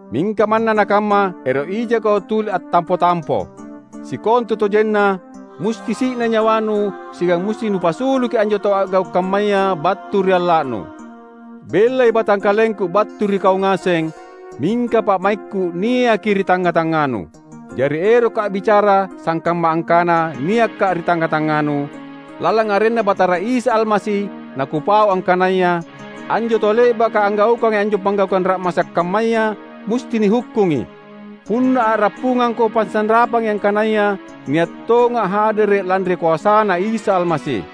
Mingka manna nakamma, ero’ ijako tuli attampo-tampo. Sikontutojenna, musti si’nai nyawanu siagang musti nupassuluki anjo tau a’gau’ kammaya battu ri alla’nu. Bellai batangkalengku battu ri kau ngaseng, mingka pa’maikku niaki ri tangnga-tangnganu. Jari erokka’ a’bicara sangkamma angkana niakka’ ri tangnga-tangnganu, "Lalang arenNa Batara Isa Almasi nakupau angkanaya, anjo tau le’baka anggaukangi anjo panggaukang ra’masa’ kammaya, musti nihukkungi!" Punna a’rappungangko pasanrapangi angkanaya nia’ tonga’ hadere’ lanri koasaNa Isa Almasi.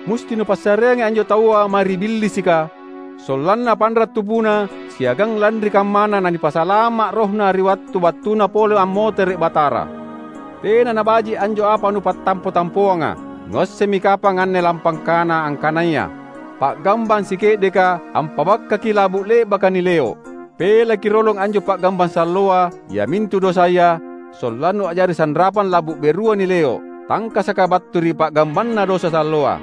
Musti nupassareangi anjo taua mae ri Billisika; sollanna panra’ tubuna siagang lanri kammana nanipasalama’ rohna ri wattu battuna pole ammotere’ Batara. Tena nabaji’ anjo apa nupattampo-tampoanga! Nuassemmi kapang anne lampangkana angkanaya, "Pa’gambang sike’deka ampa’bakkaki labu’ le’baka nileo’." Pelaki rolong anjo pa’gambang salloa, iamintu dosaya, sollannu a’jari sanrapang labu’ berua nileo’, tangkasaka battu ri pa’gambanna dosa salloa.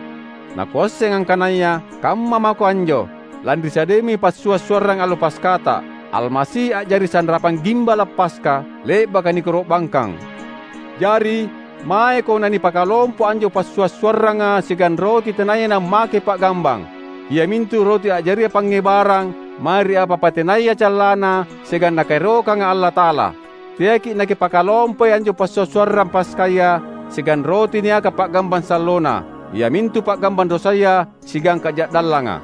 Nakuasseng angkanaya kamma mako anjo, lanri sadiami passua’-suarrang allo Paskata: Almasi a’jari sanrapang gimbala’ Paska, le’baka nikoro’bangkang. Jari, maeko nanipakalompo anjo passua’-suarranga siagang roti tenaya nammake pa’gambang; iamintu roti a’jaria pangngebarang mae ri apa-apa tenaya callana siagang Nakaerokanga Allata’ala. Teaki’ nakipakalompoi anjo passua’-suarrang Paskaya siagang roti niaka pa’gambang sallona, iamintu pa’gambang dosaya siagang kaja’dallanga.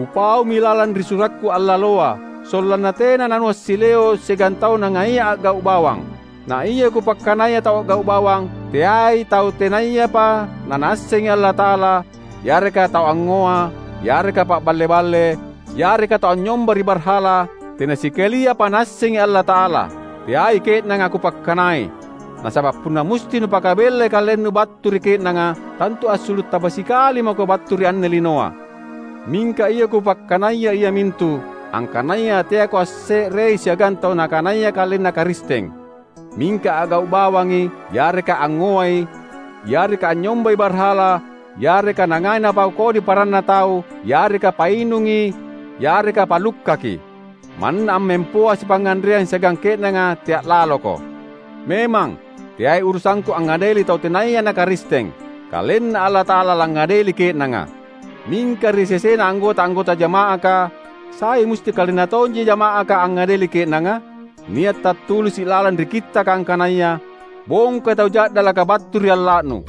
Kupaumi lalang ri surakku allaloa, sollanna tena nanuassileo’ siagang tau nangaia a’gau’ bawang. Naia kupakkanaya tau a’gau’ bawang teai tau tenayapa nanaassengi Allata’ala, yareka tau angngoa, yareka paballe-balle, yareka tau anynyomba ri barhala, tena sikaliapa naassengi Allata’ala! Teai ke’nanga kupakkanai! Nasaba’ punna musti nupakabellai kalennu battu ri ke’nanga, tantu assulu’ taba sikali mako battu ri anne linoa. Mingka ia kupakkanaya iamintu, angkanaya teako asse’rei siagang tau nakanaya kalenna Karisteng, mingka a’gau’ bawangi, yareka angngoai, yareka anynyombai barhala, yareka nangai napau kodi paranna tau, yareka painungi, yareka palukkaki. Manna ammempoa sipangnganreang siagang ke’nanga tea’ laloko! Memang, teai urusangku angngadeli tau tenaya na Karisteng. KalenNa Allata’ala langngadeli ke’nanga. Mingka ri sesena anggota-anggota jama’aka, sai musti kalenna tonji jama’aka angngadeli ke’nanga? Nia’ tattulisi’ lalang ri Kittaka angkanaya, "Bongkai tau ja’dalaka battu ri alla’nu."